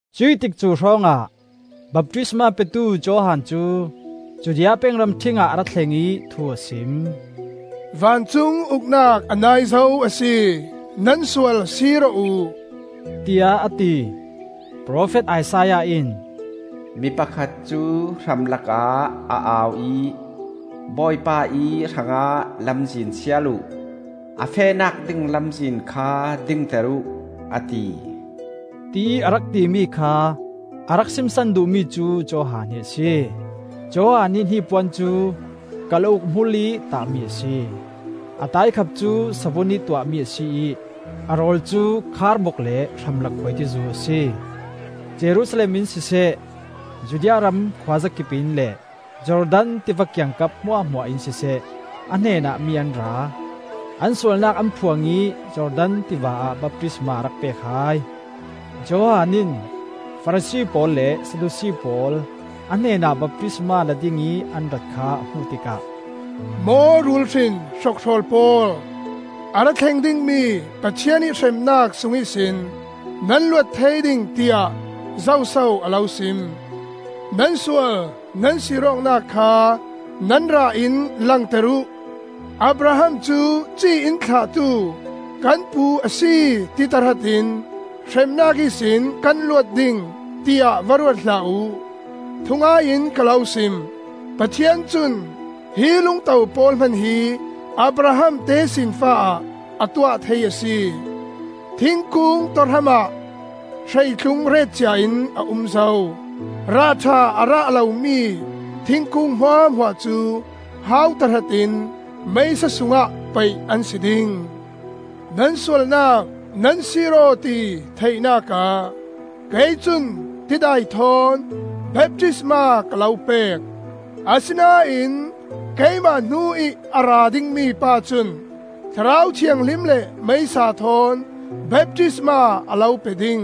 Cuih tikcu hrawngah baptisma petu Johan cu Judea peng ramṭhing ah a ra thleng ih thu a sim. “Vancung Uknak a nai zo a si. Nan sual sir aw uh,” tiah a ti. Profet Isaiah in, “Mi pakhat cu hramlakah a au ih, ‘Bawipa ih hrangah lamzin sial uh, A fehnak ding lamzin kha dingter uh,’ a ti,” tiih a rak timi kha a rak simsan duhmi cu Johan hi a si. Johan ih hnipuan cu kalauk hmulih tahmi a si, a taikhap cu savun ih tuahmi a si ih a rawl cu kharbok le hramlak khuaitizu a si. Jerusalem in siseh, Judea ram khuazakip in le Jordan tiva kiangkap hmuahhmuah in siseh, a hnenah mi an ra. An sualnak an phuang ih Jordan tiva ah baptisma a rak pek hai. Johan in Farasi pawl le Sadusi pawl a hnenah baptisma la dingih an rat kha a hmuh tikah, “Maw rul hrin hrokhrawl pawl, a ra thleng dingmi Pathian ih hremnak sung ihsin nan luat thei ding, tiah zoso a lo sim? Nan sual nan sir awknak kha nan rah in langter uh. “‘Abraham cu ci in thlahtu kan pu a si,’ ti tahrat in hremnak ihsin kan luat ding, tiah va ruat hlah uh. Thungai in ka lo sim: Pathian cun hi lungto pawl hman hi Abraham tesinfa ah a tuah thei a si. Thingkung tawhram ah hreitlung ret cia in a um zo. Rah ṭha a rah lomi thingkung hmuahhmuah cu hau tahratin meisa sungah paih an si ding. Nan sualnak nan sir-aw ti theihnak ah kei cun tidai thawn baptisma ka lo pek, asinain keimah hnu ih a ra dingmi pa cun Thlarau Thianghlim le meisa thawn baptisma a lo pe ding.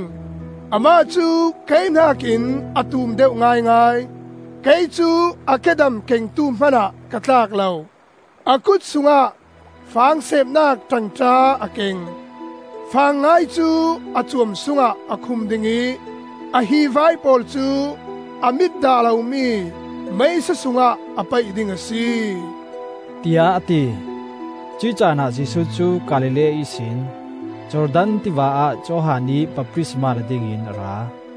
Amah cu kei hnakin a tum deuh ngaingai; kei cu a kedam kengtu hmanah ka tlak lo. A kut sungah fang seepnak ṭangṭa a keng. Fang ngai cu a cuam sungah a khum ding ih a hivai pawl cu a mit dah lomi meisa sungah a paih ding a si,” tiah a ti. Cuih caanah Jesuh cu Galilee ihsin Jordan Tiva ah Johan ih baptisma la dingin a ra.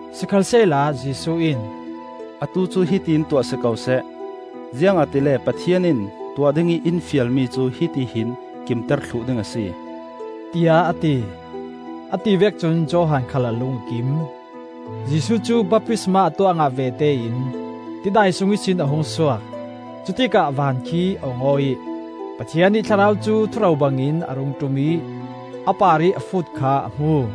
Sikhalsehla Jesuh in, “Atu cu hiti in tuah si ko seh. Ziangahtile Pathian in tuah dingih in fialmi cu hiti hin kimter thluh ding a si,” tiah a ti. A ti vek cun Johan khal a lung a kim. Jesuh cu baptisma a tuah ngah vete in tidai sung ihsin a hung suak. Cutikah van khi a ong-aw ih Pathian ih Thlarau cu thuro bangin a rung ṭum ih a parih a fut kha a hmu.